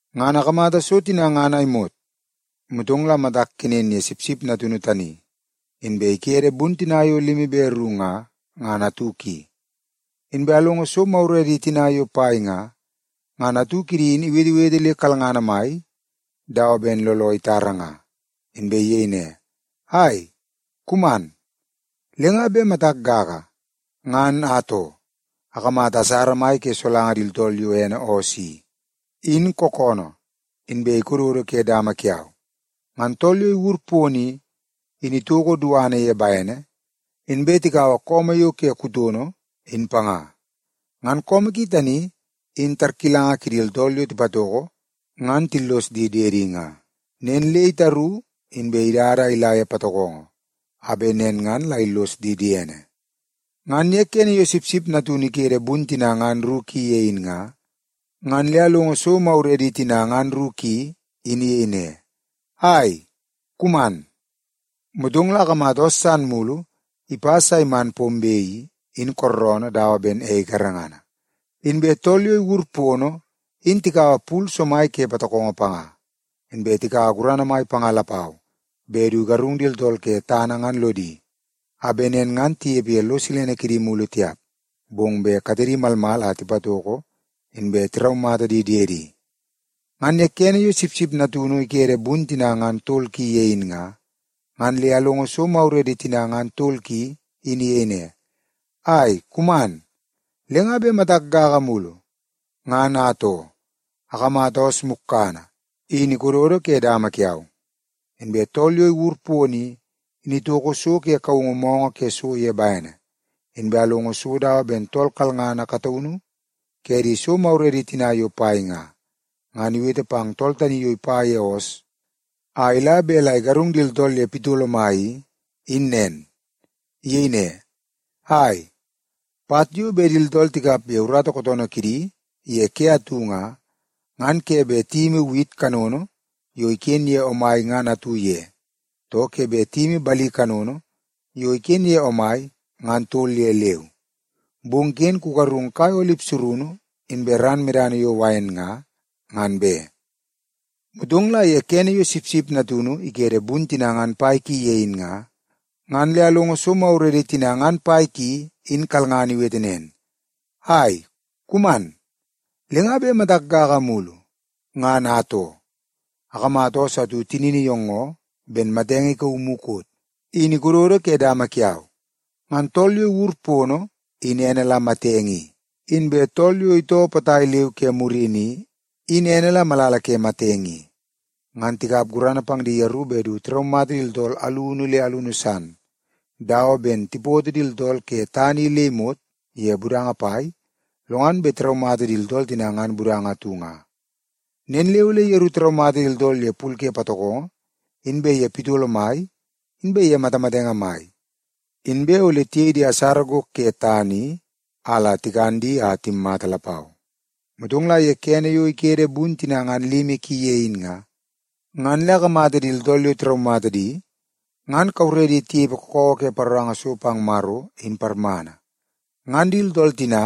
Ngan akamata so tina ngan a imot, motong la matak kenen ye Sipsip Natunu tani, inbe ikede bun tina yo limi be ru nga, ngan atu ki. Inbe alongo so maguredi tina yo pai nga, ngan atu kidi in iwetewete le kalngana mai dawa ben looloo itara nga, inbe iyei ne, “Ai, kuman!” Le nga bet matak gaga, ngan atoo, akamata asara mai ke solanga di tooltool yo ene oos i, in kookoonoo, inbe ikododo ke dama kiau. Ngan tool yo iwur pono i, in itoko duana ye bene, inbe tikaua su yo ke kutono in panga. Ngan su ki tani in tarkilanga kidi tooltool yo tipatoko ngan tillos di diedi nga. Nen le itaru inbe idada a ila ye patokongo a bet nen ngan la illos di diene. Ngan ye kene yo Sipsip Natunu ikede bun tina ngan ru ki ye in nga, ngan le alongo so maguredi tina ngan ru ki in iyei ne, “Ai, kuman!” Motong la akamata oos san mulu ipas a iman pombe i, in kooroonoo dawa ben ei garengana. Inbe tool yo iwur pono in tikaua pul somai ke patokongo panga, inbe tikaua gurana mai panga lapau bet du igarung di tooltool ke tana ngan lodi, a bet nen ngan tinepe ye lo silene kidi mulu tiap, bong bet katedi malmal a tipatoko inbe tiraumata di diedi. Ngan ye kene yo Sipsip Natunu ikede bun tina ngan tol ki ye in nga, ngan le alongo so maguredi tina ngan tol ki in iyei ne, “Ai, kuman!” Le nga bet matak gaga mulu, ngan atoo, akamata oos mukkana in ikododo ke dama kiau, inbe tool yo iwur pono i, in itoko so ke kaungu moonoo ke so ye bene. Inbe alongo so dawa ben tool kalngana kataunu ke di so maguredi tina yo pai nga, ngan iwete pang tool tani yo bet ipa ye oos a ila bet la igarung di tooltool ye pitolo mai i, in nen. Iyei ne, “Ai, pat yo bet di tooltool tikap ye urata kootoonoo kidi ye ke atu nga, ngan ke bet tiyimi wit kanono yo iken ye omai ngan atu ye, too ke bet tiyimi bali kanono yo iken ye omai ngan tol ye leu. Bong ken kugarung kai olip surunu inbe ran medana yo wain nga, ngan be!” Motong la ye kene yo Sipsip Natunu ikede bun tina ngan pai ki ye in nga, ngan le alongo so maguredi tina ngan pai ki in kalngana iwete nen, “Ai, kuman!” Le nga bet matak gaga mulu, ngan atoo, akamata oos atu tinini iyoongoo ben matamatenge ikauu mukot, in ikododo ke dama kiau. Ngan tool yo iwur pono in ene la Matenge i, inbe tool yo itoo potai leu ke murini i, in ene la Malala ke Matenge i. Ngan tikap gurana pang di yeru bet du tiraumata di tooltool alunu le alunu san dawa ben tipoto di tooltool ke tana i le imot ye budanga pai, lo ngan bet tiraumata di tooltool tina ngan budanga atu nga. Nen le ole yeru tiraumata di tooltool ye pul ke patokongo, inbe ye pitolo mai, inbe ye matamatenge mai, inbe ole tiyei di asara gok ke tana i a la tikan di a timmata lapau. Motong la ye kene yo ikede bun tina ngan limi ki ye in nga, ngan le akamata di tooltool yo tiraumata di ngan kauredi tinepe kakawa ke paroranga so pang Maro in parmana. Ngan di tooltool tina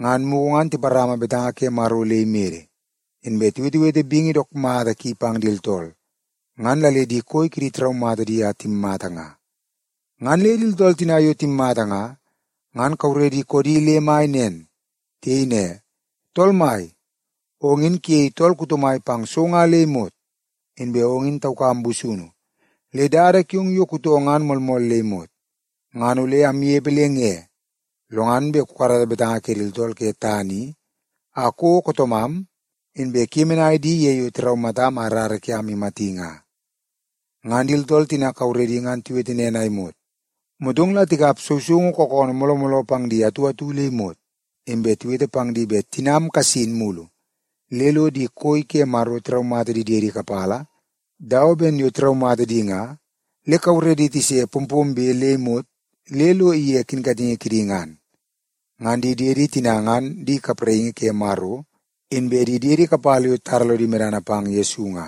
ngan mugu ngan tiparama betanga ke Maro le imede, inbe tiwetewete bingi dook mata ki pang di tooltool, ngan la le di koi kidi tiraumata di a timmata nga. Ngan le di tooltool tina yo timmata nga, ngan kauredi koodi le mai nen. Tiyei ne, “Tool Mai, ong in kuyei tool kuto mai pang so nga le imot. Inbe ong in taukam busunu le dada kiong yo kutoo ngan moolmool le imot. Ngan ole amnepe le nge, lo ngan bet kukarata betanga ke di tooltool ke tana i a kouo kootoomam, inbe kuyemenai di ye yo tiraumatam a rara kiam imati nga?” Ngan di tooltool tina kauredi ngan tiwete nen a imot, motong la tikap sousoungu kookoonoo mooloo mooloo pang di atu atu le imot. Inbe tiwete pang di bet tinam kasin mulu le lo di koi ke Maro tiraumata di diedi kapala dawa ben yo tiraumata di nga, le kauredi tise pompombe le imot le lo ige kinkatingi kidi ngan. Ngan di diedi tina ngan di kapraingi ke Maro inbe di diedi kapala yo titara lodi medana pang Yesu nga.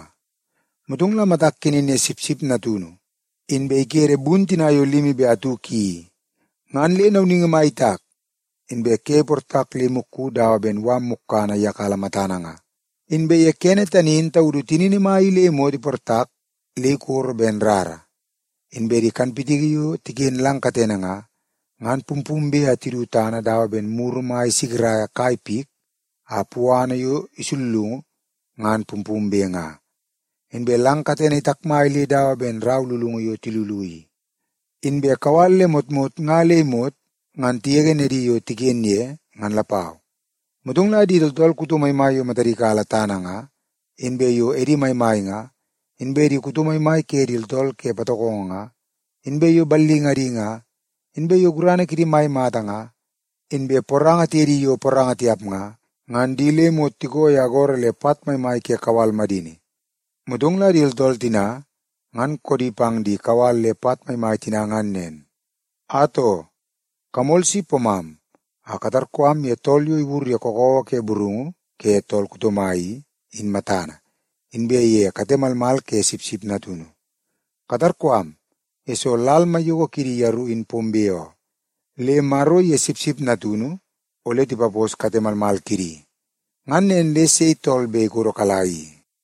Motong la matak kenen ye Sipsip Natunu, inbe ikede bun tina yo limi be atu ki i, ngan le nauningi mai itak, inbe ke iportak le imukku dawa ben mala mukkana iyakala matana nga. Inbe ye kene tani in taudu tinini mai i le imot iportak le ikoro ben rara, inbe di kanpitiki yo tiken lang katene nga, ngan pumpumbe a tidu tana dawa ben muru mai isikiraia kai pik a puana yo isullungu ngan pumpumbe nga. Inbe lang katene itakmai le dawa ben rau lulungu yo tilulu i, inbe kawal le motmot nga le imot ngan tigege nedi yo tiken ye, ngan lapau. Motong la di tooltool kuto maimai yo matadi kala tana nga, inbe yo edi maimai nga, inbe di kuto maimai ke di tooltool ke patokongo nga, inbe yo ballingadi nga, inbe yo gurana kidi mai mata nga, inbe poranga tiye di yo poranga tiap nga, ngan di le imot tiko ye agoro le pat maimai ke kawal madini. Motong la di tooltool tina ngan koodi pang di kawal le pat maimai tina ngan nen, “Atoo, kamol si pomam a katarkoo am ye tool yo iwur ye kakawa ke burungu ke tool kuto mai i, in matana, inbe ye kate malmal ke Sipsip Natunu. Katarkoo am, yesoo lal maiyoko kidi yeru in pombe oo, le Maro iye Sipsip Natunu ole tipaposo kate malmal kidi. Ngan nen le sei tool bet ole ikodokala i?”